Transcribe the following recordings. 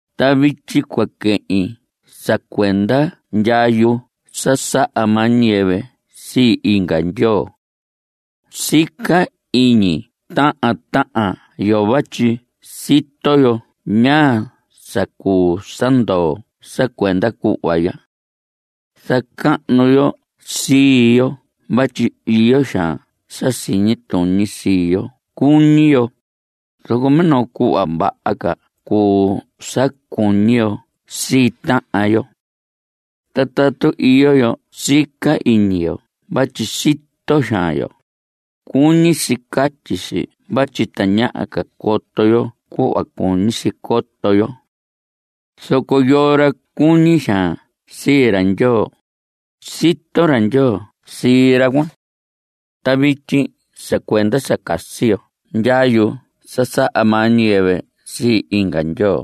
Ta vityi cua quehin sa cuenda ndyayu sa saha maa ñiyɨvɨ sii inga ndyoo. Sica iñi tahan tahan yo vatyi sito yo ñaa sa cuu sa ndoo sa cuenda cuhva ya. Zacahnu yo sii yo vatyi iyo xaan sa siñi tuñi sii yo cuñi yo. Zoco minoo cuhva vaha ca cuu sa cuñi yo sii tahan yo. Ta tatu iyo yo sica iñi yo vatyi sito xaan yo, cuñi si catyi si vatyi tañaha ca coto yo cuhva cuñi si coto yo. Zoco yoo ra cuñi xaan sii ra Ndyoo, sito ra Ndyoo sii ra cuan. Ta vityi sa cuenda sa casi yo ndyayu sa saha maa ñiyɨvɨ sii inga ndyoo,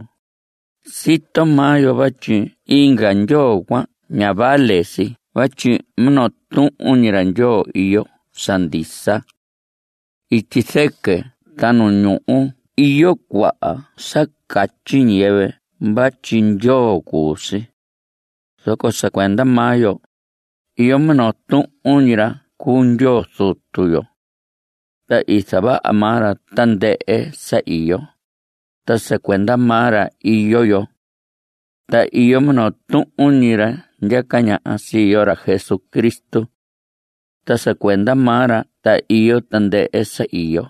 sito maa yo vatyi inga ndyoo cuan ña vale si vatyi minoo tuhun ñi ra Ndyoo iyo sa ndisa. Ityi zɨquɨ ta nu ñuhu iyo cuaha sa catyi ñiyɨvɨ vatyi ndyoo cuu si. Zoco sa cuenda maa yo, iyo minoo tuhun ñi ra cuu Ndyoo Zutu yo. Ta i zavaha maa ra tandɨhɨ sa iyo. Ta sa cuenda maa ra iyo yo. Ta iyo minoo tuhun ñi ra ndyaca ñaha sii yo, ra Jesucristo. Ta sa cuenda maa ra ta iyo tandɨhɨ sa iyo;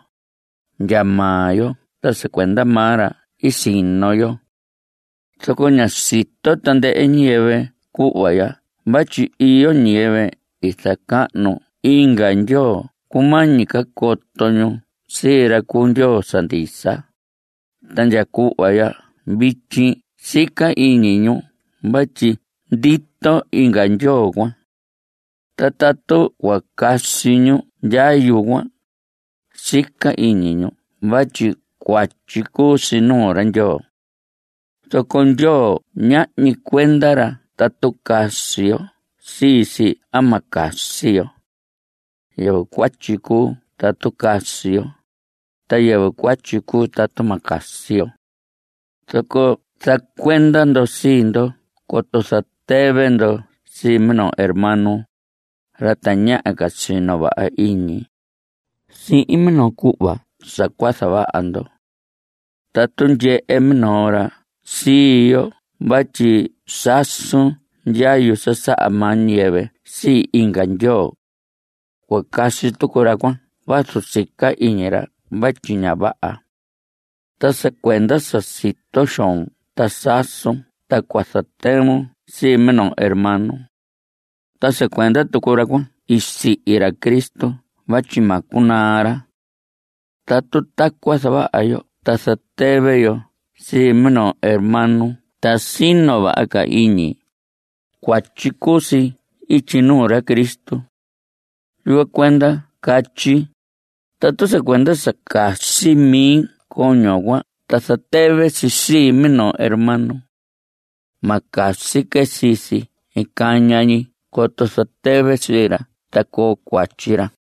ndya maa yo ta sa cuenda maa ra i sino yo. Zoco ña sito tandɨhɨ ñiyɨvɨ cuhva ya vatyi iyo ñiyɨvɨ i zacahnu inga ndyoo cumañi ca coto ñu sii ra cuu Ndyoo sa ndisa, ta ndya cuhva ndya vityi sica iñi ñu vatyi ndito inga ndyoo cuan. Ta tatu cua casi ñu ndyayu cuan, sica iñi ñu vatyi cuatyi cuu si nuu ra Ndyoo. Zoco Ndyoo ñahñi cuenda ra tatu casi yo sii si a ma casi yo. Yɨvɨ cuatyi cuu tatu casi yo, ta yɨvɨ cuatyi cuu tatu ma casi yo. Zoco zacuenda ndo sii ndo coto zatɨvɨ ndo sii minoo hermano, ra tañaha ca sino vaha iñi, sihin minoo cuhva sa cua zavaha ndo. Tatu ndyehe minoo ra sii yoho vatyi sasun ndyayu sa saha maa ñiyɨvɨ sii inga ndyoo. Cua casi tucu ra cuan vazu sica iñi ra vatyi ña vaha. Ta sa cuenda sa sito xoon ta sasun ta cua zatɨvun sii minoo hermano. Ta sa cuenda tucu ra cuan i sihi ra Cristo vatyi ma cunaa ra. Tatu tacuan zavaha yo ta zatɨvɨ yo sii minoo hermano ta sino vaha ca iñi, cuatyi cuu si ityi nuu ra Cristo. Yucuan cuenda catyi, tatu sa cuenda sa casi mi coño cuan ta zatɨvɨ si sii minoo hermano. Ma casi que sii si caña ñi coto zatɨvi sii ra ta coo cuatyi ra.